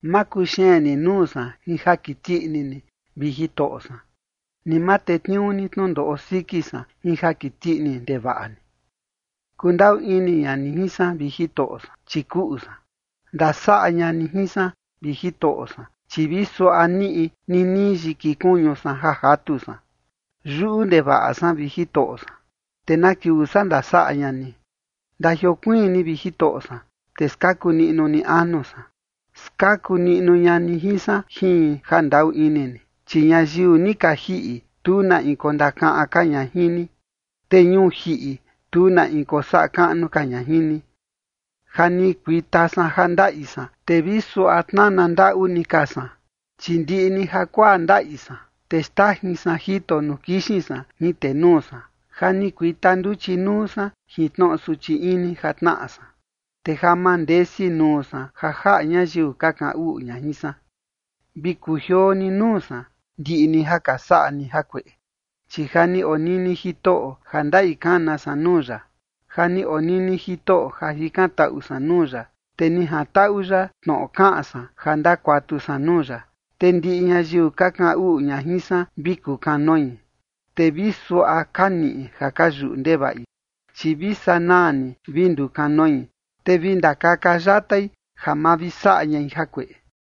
Ma kuxeen ni nuu san jin ja kiti ini ni, vi Jitoꞌo san, ni ma tetniuu ni tnundoꞌo siki san jin ja kiti ini ndevaꞌa ni. Kundaꞌu ini ña ni jin san, vi Jitoꞌo san, chi kuꞌu san. Ndasaꞌa ña ni jin san, vi Jitoꞌo san, chi vi suaꞌa niꞌi ninii yiki kuñu san ja jatu san. Yuꞌu ndevaꞌa san, vi Jitoꞌo san, ¿te na kiuu saa ndasaꞌa ña ni? Ndajiokuiin ni, vi Jitoꞌo san, te skaku niꞌnu ni anu san. Skaku niꞌnu ña ni jin san jin jandaꞌu ini ni. Chi ñayiu ni ka jiꞌi, tu na in kondakaꞌan ka ña jin ni, te ñuu jiꞌi, tu na in kosaꞌa kaꞌnu ka ña jin ni. Ja ni kuita san ja ndaꞌi san, te vi suaꞌa tnana ndaꞌu ni ka san, chi ndiꞌi ni jakuaa ndaꞌi san, te xtajin san jito nuu kixin san jin tenuu san. Ja ni kuita nduchi nuu san jin tnoꞌo suchi ini ja tnaꞌa san, te ja mandesi nuu san ja jaꞌa ñayiu ka kaꞌan uꞌu ña jin san. Vi kujioo ni nuu san, ndiꞌi ni ja ka saꞌa ni jakueꞌe, chi ja ni onini Jitoꞌo ja ndaꞌi kana san nuu ya. Ja ni onini Jitoꞌo ja jikantaꞌu san nuu ya, te ni jantaꞌu ya tnoꞌo kaꞌan san ja ndakuatu san nuu ya. Te ndiꞌi ñayiu ka kaꞌan uꞌu ña jin san vi kukanoi, te vi suaꞌa ka niꞌi ja ka yuꞌu ndevaꞌi, chi vi sanaa ni vi ndukanoi, te vi ndakaka yatai ja ma vi saꞌa ñai jakueꞌe.